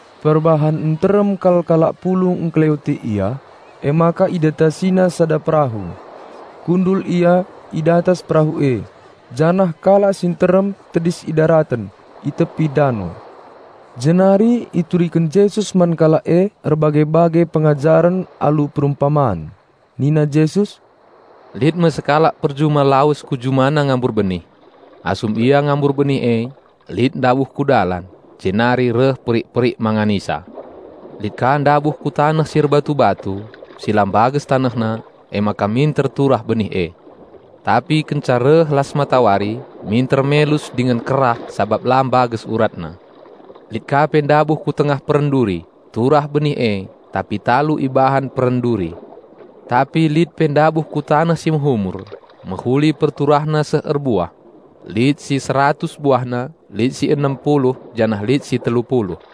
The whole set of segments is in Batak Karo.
Perbahan nterem kal kalak pulung ngkeleweti Ia, emaka IdatasiNa sada perahu. Kundul Ia i datas perahu e, janah kalak si nterem tedis i daraten, i tepi dano. Jenari ituriken Jesus man kalak e erbage-bage pengajaren alu perumpaman. Nina Jesus, "Lit me sekalak perjuma lawes ku jumana ngambur benih. Asum ia ngambur benih e, lit ndabuh ku dalan, jenari reh perik-perik manganisa. Lit ka ndabuh ku taneh si erbatu-batu, si la mbages tanehna, emaka minter turah benih e. Tapi kenca reh las matawari, minter melus dingen kerah sabap la mbages uratna. Lit ka pe ndabuh ku tengah peren duri, turah benih e, tapi talu ibahan peren duri. Tapi lit pe ndabuh ku taneh si mehumur, mehuli perturahna seh erbuah; lit si seratus buahna, lit si enem puluh janah lit si telu puluh.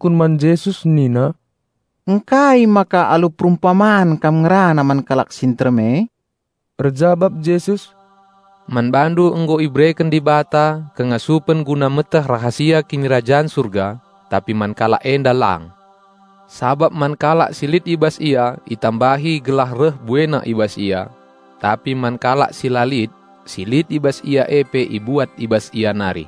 Jenari reh ajar-ajar nungkun man Jesus nina, "Ngkai maka alu perumpaman Kam ngerana man kalak si nterem e?" Erjabap Jesus, "Man bandu nggo ibereken Dibata kengasupen guna meteh rahasia Kinirajan Surga, tapi man kalak enda lang. Sabap man kalak si lit i bas ia itambahi gelah reh buena i bas ia; tapi man kalak si la lit, si lit i bas ia e pe ibuat i bas ia nari.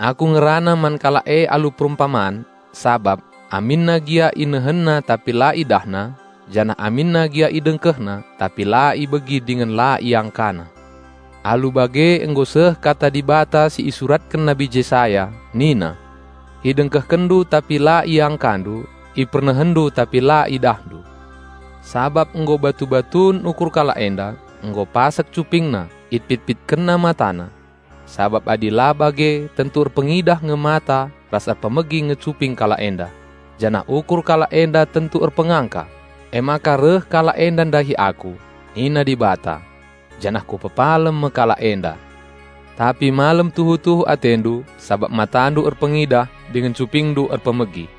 Aku ngerana man kalak e alu perumpaman sabap: aminna gia inehenna tapi la idahna, janah aminna gia idengkehkenna tapi la ibegi dingen la iangkana. Alu bage nggo seh Kata Dibata si isuratken Nabi Jesaya, nina: 'Idengkehkenndu tapi la iangkandu; ipernehenndu tapi la idahndu. Sabap nggo batu-batun ukur kalak enda; nggo pasek cupingna, ipit-pitkenna matana. Sabap adi la bage tentu erpengidah nge mata ras erpemegi nge cuping kalak enda, janah ukur kalak enda tentu erpengangka, emaka reh kalak enda ndahi Aku, nina Dibata, janah Kupepalem me kalak enda.' Tapi melem tuhu-tuhu atendu, sabap matandu erpengidah dingen cupingndu erpemegi.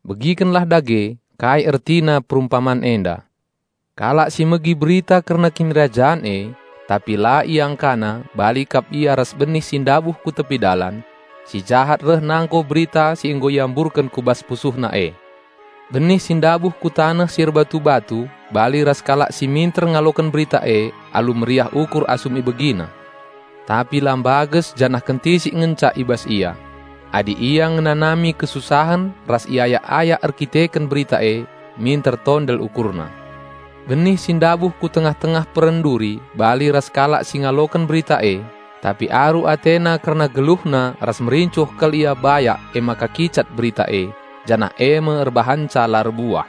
"Begikenlah dage, kai ertina perumpaman enda. Kalak si megi Berita kerna Kinirajan e, tapi la iangkana bali kap ia ras benih si ndabuh ku tepi dalan. Si jahat reh nangko berita si nggo iamburken ku bas pusuhna e. Benih si ndabuh ku taneh si erbatu-batu bali ras kalak si minter ngaloken Berita e alu meriah ukur asum ibegina. Tapi la mbages janah kentisik ngenca i bas ia. Adi ia ngenanami kesusahen ras iayak-ayak erdandanken Berita e, minter tondel ukurna. Benih si ndabuh ku tengah-tengah peren duri bali ras kalak si ngaloken Berita e; tapi aru atena kerna geluhna ras merincuh kal ia bayak emaka kicat Berita e, janah eme erbahanca la erbuah.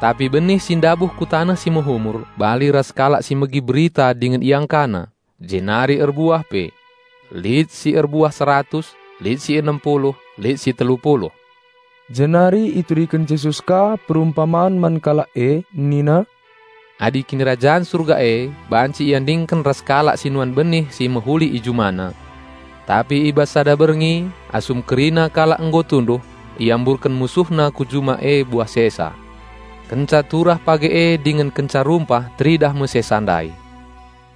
Tapi benih si ndabuh ku taneh si mehumur bali ras kalak si megi Berita dingen iangkana, jenari erbuah pe; lit si erbuah seratus, lit si enem puluh, lit si telu puluh." Jenari ituriken Jesus ka perumpaman man kalak e nina, "Adi Kinirajan Surga e banci iandingken ras kalak si nuan benih si mehuli i jumana. Tapi i bas sada berngi, asum kerina kalak nggo tunduh, iamburken musuhna ku juma e buah sesa. Kenca turah page e dingen kenca rumpah teridah me sesa ndai.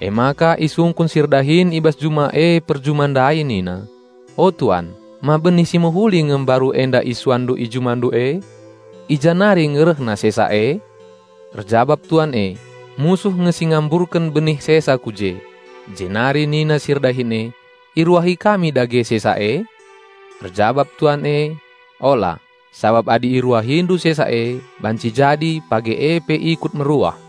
Emaka isungkun si erdahin i bas juma e perjuma ndai nina, 'O tuan, ma benih si mehuli nge mbaru enda isuanndu i jumandu e? I ja nari nge rehna sesa e?' Erjabap tuan e, 'Musuh nge si ngamburken benih sesa ku je.' Jenari nina si erdahin e, 'Iruahi kami dage sesa e?' Erjabap tuan e, 'Ola, sabap adi iruahindu sesa e, banci jadi page e pe ikut meruah.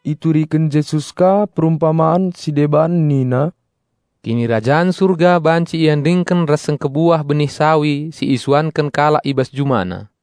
Ituriken Jesus ka perumpaman si deban nina, "Kinirajan Surga banci iandingken ras sengkebuah benih sawi si isuanken kalak i bas jumana.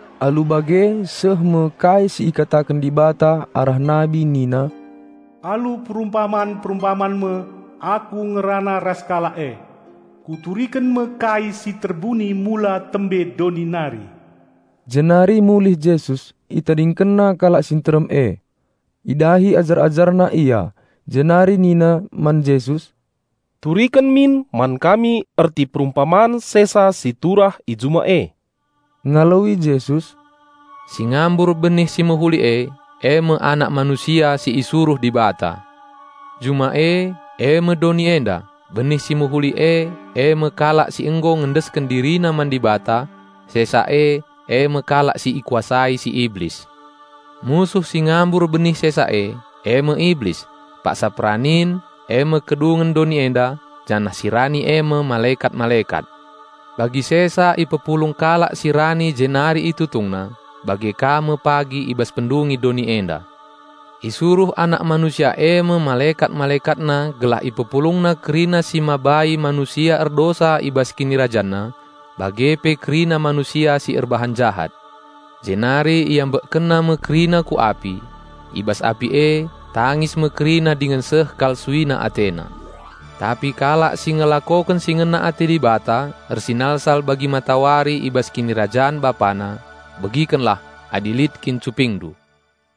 Alu bage seh me kai si ikataken Dibata arah nabi nina, "Alu perumpaman-perumpaman me Aku ngerana ras kalak e; Kuturiken me kai si terbuni mula tembe doni nari." Jenari mulih Jesus, ItadingkenNa kalak si nterem e. Idahi ajar-AjarNa Ia, jenari nina man Jesus, "Turiken min man kami erti perumpaman sesa si turah i juma e." Ngaloi Jesus, "Si ngambur benih si mehuli e, eme Anak Manusia si isuruh Dibata; juma e, eme doni enda; benih si mehuli e, eme kalak si nggo ngendesken dirina man Dibata. Sesa e, eme kalak si ikuasai si Iblis; musuh si ngambur benih sesa e, eme Iblis. Paksa peranin, eme kedungen doni enda, janah si rani eme malekat-malekat. Bagi sesa ipepulung kalak si rani jenari itutungna, bage ka me pagi i bas pendungi doni enda. Isuruh Anak Manusia eme malekat-MalekatNa mpepulung i bas KinirajanNa nari kerina si mabai manusia erdosa bage pe kerina manusia si erbahan jahat, jenari IambekkenNa me kerina ku api. I bas api e, tangis me kerina dingen seh kal suina atena. Tapi kalak si ngelakoken si ngena ate Dibata ersinalsal bagi matawari i bas Kinirajan Bapana. Begikenlah, adi lit kin cupingndu!"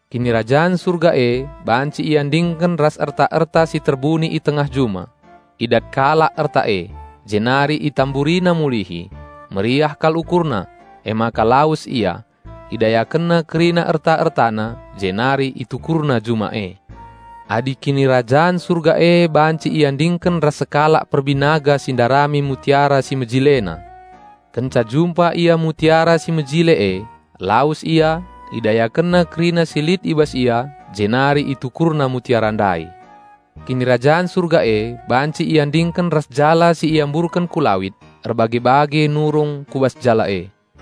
"Kinirajan Surga e banci iandingken ras erta-erta si terbuni i tengah juma. Idat kalak erta e, jenari itamburina mulihi. Meriah kal ukurna, emaka lawes ia, idayakenna kerina erta-ertana, jenari itukurna juma e." "Adi Kinirajan Surga e banci iandingken ras sekalak perbinaga si ndarami mutiara si mejilena. Kenca jumpa ia mutiara si mejile e, lawes ia, idayakenna kerina si lit i bas ia, jenari itukurna mutiara ndai." "Kinirajan Surga e banci iandingken ras jala si iamburken ku lawit. Erbage-bage nurung ku bas jala e.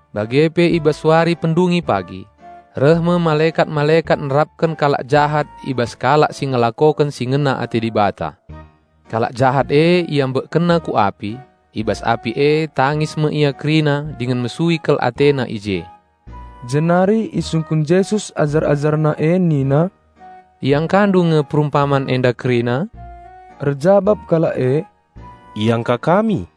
Bage pe i bas wari pendungi pagi: reh me malekat-malekat nerapken kalak jahat i bas kalak si ngelakoken si ngena ate Dibata. Kalak jahat e iambekkenna ku api. I bas api e tangis me ia kerina dingen mesui kal atena i je." Jenari isungkun Jesus ajar-AjarNa e nina, "Iangkandu nge perumpaman enda kerina?" Erjabap kalak e, "Iangka kami."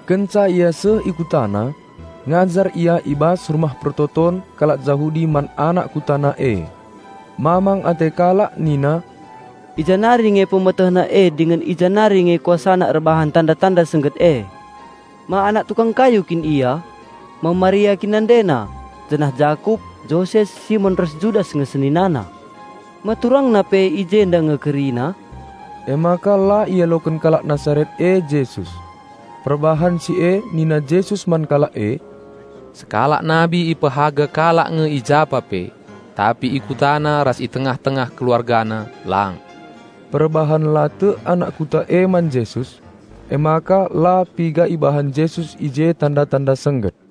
Kenca Ia seh i KutaNa, ngajar Ia i bas rumah persembahen kalak Jahudi man anak KutaNa e. Mamang ate kalak nina, "I ja nari nge PemetehNa e dingen i ja nari nge KuasaNa erbahan tanda-tanda sengget e? Ma Anak tukang kayu kin Ia? Ma Maria kin NandeNa, janah Jakup, Joses, Simon ras Judas nge SeninaNa? Ma TurangNa pe i jenda nge kerina?" Emaka la ialoken kalak Nasaret e Jesus. Perbahan si e nina Jesus man kalak e, "Sekalak nabi ipehaga kalak nge i japa pe; tapi i kutana ras i tengah-tengah keluargana lang." Perbahan la tek anak kuta e man Jesus, emaka la piga ibahan Jesus i je tanda-tanda sengget.